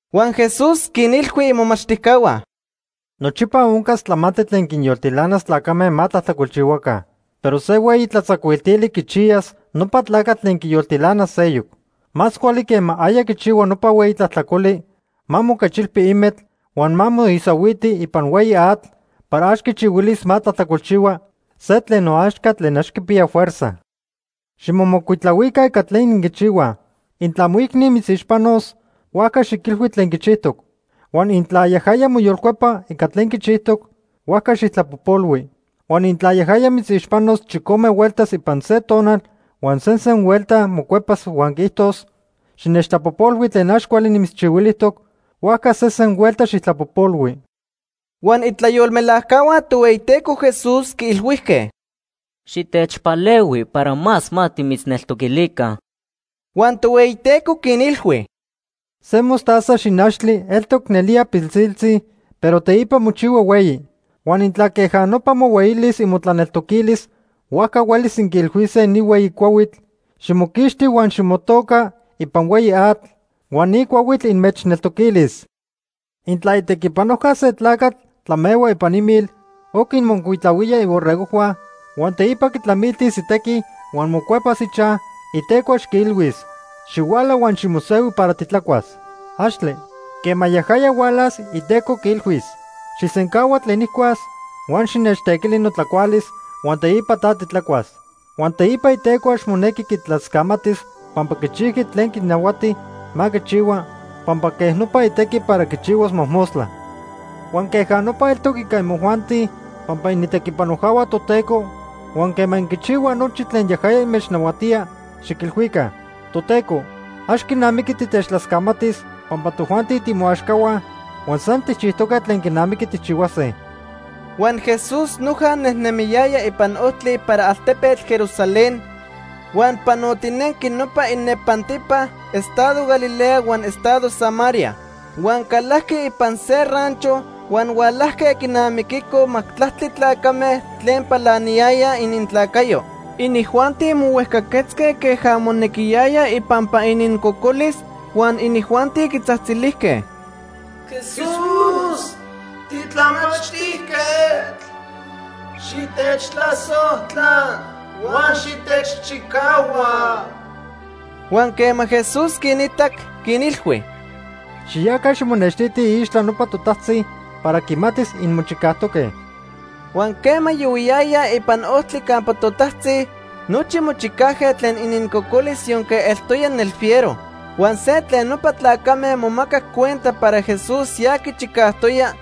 Huan Jesús quinilhui imomachtijcahua: “Nochipa oncas tlamantli tlen quinyoltilanas tlacame ma tlajtlacolchihuaca. Pero se hueyi tlatzacuiltili quichiyas nopa tlacatl tlen quiyoltilanas seyoc. Más cuali quema aya quichihua nopa hueyi tlajtlacoli, ma moquechilpi imetl huan ma moisahuiti ipan hueyi atl para ax quichihuilis ma tlajtlacolchihua se tlen noaxca tlen ax quipiya fuerza. Ximomocuitlahuica ica tlen inquichihuaj. “Intla moicni mitzixpanos, huajca xiquilhui tlen quichijtoc. Huan intla yajaya moyolcuepa ica tlen quichijtoc, huajca xijtlapojpolhui. Huan intla yajaya mitzixpanos chicome hueltas ipan se tonal huan sesen huelta mocuepas huan quiijtos: ‘Xinechtlapojpolhui tlen ax cuali nimitzchihuilijtoc’, huajca sesen huelta xijtlapojpolhui.” Huan itlayolmelajcahua Tohueyiteco Jesús quiilhuijque: ―Xitechpalehui para más ma timitzneltoquilica. Huan Tohueyiteco quinilhui: ―Se mostaza xinachtli eltoc nelía pilsiltzi pero teipa mochihua hueyi. Huan intla queja nopa mohueyilis imotlaneltoquilis, huajca huelis inquiilhuise ni hueyi cuahuitl: ‘Ximoquixti huan ximotoca ipan hueyi atl’, huan ni cuahuitl inmechneltoquilis. “Intla itequipanojca se tlacatl tlamehua ipan imil o quinmocuitlahuía iborregojhua, huan teipa quitlamiltis itequi huan mocuepas ichaj, iteco ax quiilhuis: ‘Xihuala huan ximosehui para titlacuas.’ ¡Axtle! Quema yajaya hualas, iteco quiilhuis: ‘Xijsencahua tlen nijcuas huan xinechtequili notlacualis huan teipa ta titlacuas.’ Huan teipa iteco ax monequi quitlascamatis pampa quichijqui tlen quinahuati ma quichihua pampa quejnopa itequi para quichihuas mojmostla. Huan queja nopa eltoc ica imojuanti pampa initequipanojcahua Toteco, huan quema inquichihuaj nochi tlen yajaya inmechnahuatía, xiquilhuica: ‘Toteco, ax quinamiqui titechtlascamatis pampa tojuanti timoaxcahua huan san tijchijtoque tlen quinamiqui tijchihuase.’” Huan Jesús noja nejnemiyaya ipan ojtli para altepetl Jerusalén huan panotinenqui nopa inepantipa estado Galilea huan estado Samaría. Huan calajqui ipan se rancho huan hualajque quinamiquicoj majtlactli tlacame tlen palaniyayaj inintlacayo. Inijuanti mohuejcaquetzque queja monequiyaya ipampa inincocolis, huan inijuanti quitzajtzilijque: ―Jesús, titlamachtijquetl, xitechtlasojtla huan xitechchicahua. Huan quema Jesús quinitac, quinilhui: ―Xiyaca ximonextitij iixtla nopa totajtzi para quimatis inmochicajtoque. Huan quema yohuiyayaj ipan ojtli campa totajtzi, nochi mochicajque tlen inincocolis yonque eltoya nelfiero. Huan se tlen nopa tlacame momacac cuenta para Jesús ya quichicajtoya,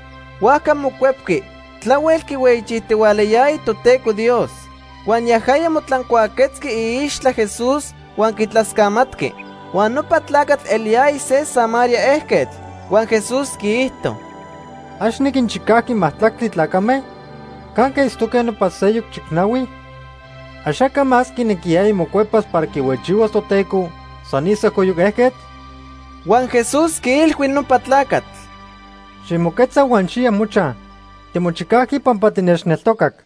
huajca mocuepqui, tlahuel quihueyichijtihualayaya Toteco Dios. Huan yajaya motlancuaquetzqui iicxitla Jesús huan quitlascamatqui. Huan nopa tlacatl eliyaya se Samaría ejquetl. Huan Jesús quiijto: ―¿Ax niquinchicajqui majtlactli tlacame? ¿Canque itztoque nopa seyoc chicnahui? ¿Axaca más quinequiyaya mocuepas para quihueyichihuas Toteco, san ni sejcoyoc ejquetl? Huan Jesús quiilhui nopa tlacatl: ―Ximoquetza huan xiya mochaj. Timochicajqui pampa tinechneltocac.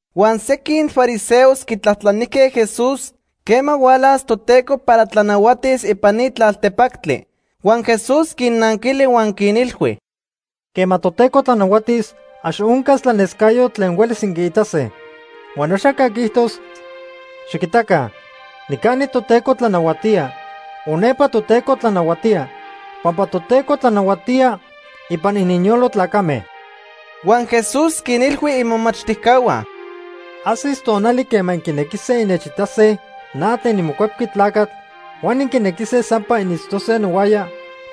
Huan sequin fariseos quitlajtlanijque Jesús quema hualas Toteco para tlanahuatis ipan ni tlaltepactli. Huan Jesús quinnanquili huan quinilhui: ―Quema Toteco tlanahuatis, ax oncas tlanescayotl tlen huelis inquiitase. Huan axaca quiijtos: ‘Xiquitaca, nicani Toteco tlanahuatía’ o ‘Nepa Toteco tlanahuatía’, pampa Toteco tlanahuatía ipan ininyolo tlacame. Huan Jesús quinilhui imomachtijcahua: ―Ajsis tonali quema inquinequise innechitase na tlen niMocuepqui Tlacatl huan inquinequise sampa initztose nohuaya,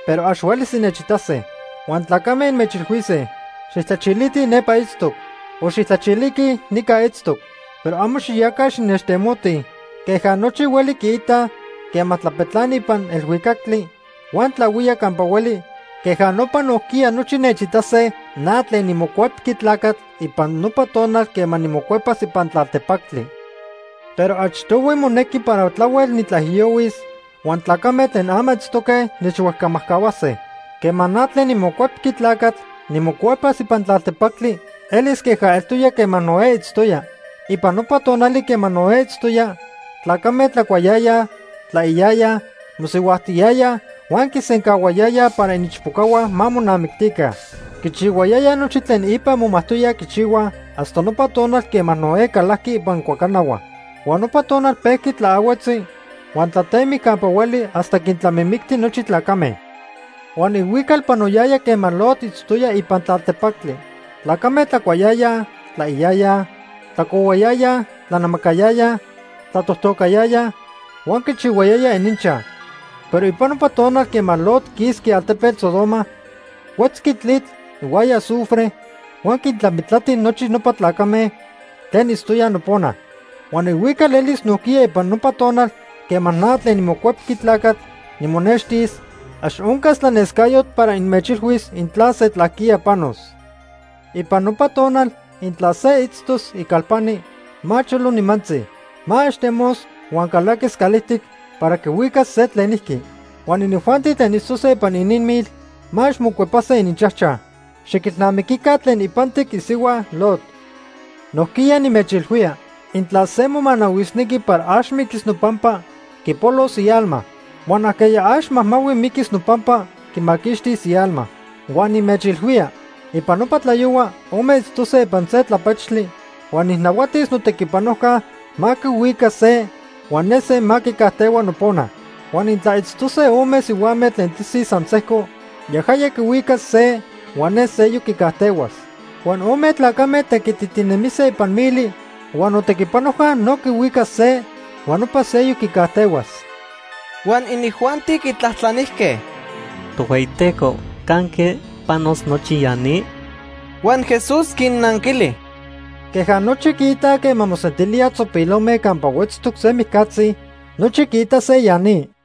pero ax huelis innechitase. Huan tlacame inmechilhuise: ‘Xijtlachilitij nepa itztoc’ o ‘Xijtlachiliquij nica itztoc’, pero amo xiyaca xinechtemotij. Queja nochi hueli quiitaj quema tlapetlani ipan elhuicactli huan tlahuía campa hueli, queja nopa nojquiya nochi nechitase na tlen niMocuepqui Tlacatl ipan nopa tonal quema nimocuepas ipan tlaltepactli. Pero achtohui monequi para tlahuel nitlaijiyohuis, huan tlacame tlen ama itztoque nechhuejcamajcahuase. “Quema na tlen niMocuepqui Tlacatl nimocuepas ipan tlaltepactli elis queja eltoya quema Noé itztoya. Ipan nopa tonali quema Noé itztoya, tlacame tlacuayayaj, tlaiyayaj, mosihuajtiyayaj huan quisencahuayayaj para iniichpocahua ma monamictica. Quichihuayayaj nochi tlen ipa momajtoyaj quichihuaj hasta nopa tonal quema Noé calajqui ipan cuacanahua. Huan nopa tonal pejqui tlaahuetzi huan tlatemic campa hueli hasta quintlamimicti nochi tlacame. “Huan ihuical panoyaya quema Lot itztoya ipan tlaltepactli. Tlacame tlacuayayaj, tlaiyayaj, tlacohuayayaj, tlanamacayayaj, tlatojtocayayaj huan quichihuayayaj ininchaj. Pero ipan nopa tonal quema Lot quisqui altepetl Sodoma, huetzqui tlitl ihuaya azufre huan quintlamitlati nochi nopa tlacame tlen itztoyaj nopona. Huan ihuical elis nojquiya ipan nopa tonal quema na tlen niMocuepqui Tlacatl nimonextis, ax oncas tlanescayotl para inmechilhuis intla se tlajquía panos. “Ipan nopa tonal intla se itztos icalpani, ma cholo nimantzi. Ma ax temos huan calaquis calijtic para quihuicas se tlenijqui. Huan inijuanti tlen itztose ipan ininmil ma ax mocuepase ininchajchaj. Xiquilnamiquica tlen ipantic isihua Lot. Nojquiya nimechilhuía intla se momanahuisnequi para ax miquis nopampa, quipolos ialma. Huan ajqueya ax majmahui miquis nopampa, quimaquixtis ialma. “Huan nimechilhuía, ipan nopa tlayohua, ome itztose ipan se tlapechtli, huan nijnahuatis notequipanojca ma quihuica se huan ne se ma quicajtehua nopona. Huan intla itztose ome sihuame tlen tisij san sejco, yajaya quihuicas se huan ne seyoc quicajtehuas. Huan ome tlacame tequititinemise ipan mili, huan notequipanojca no quihuicas se huan nopa seyoc quicajtehuas.” Huan inijuanti quitlajtlanijque: ―Tohueyiteco, ¿canque panos nochi ya ni? Huan Jesús quinnanquili: ―Queja nochi quiitaj quema mosentilíaj tzopilome campa huetztoc se mijcatzi, nochi quiitase ya ni.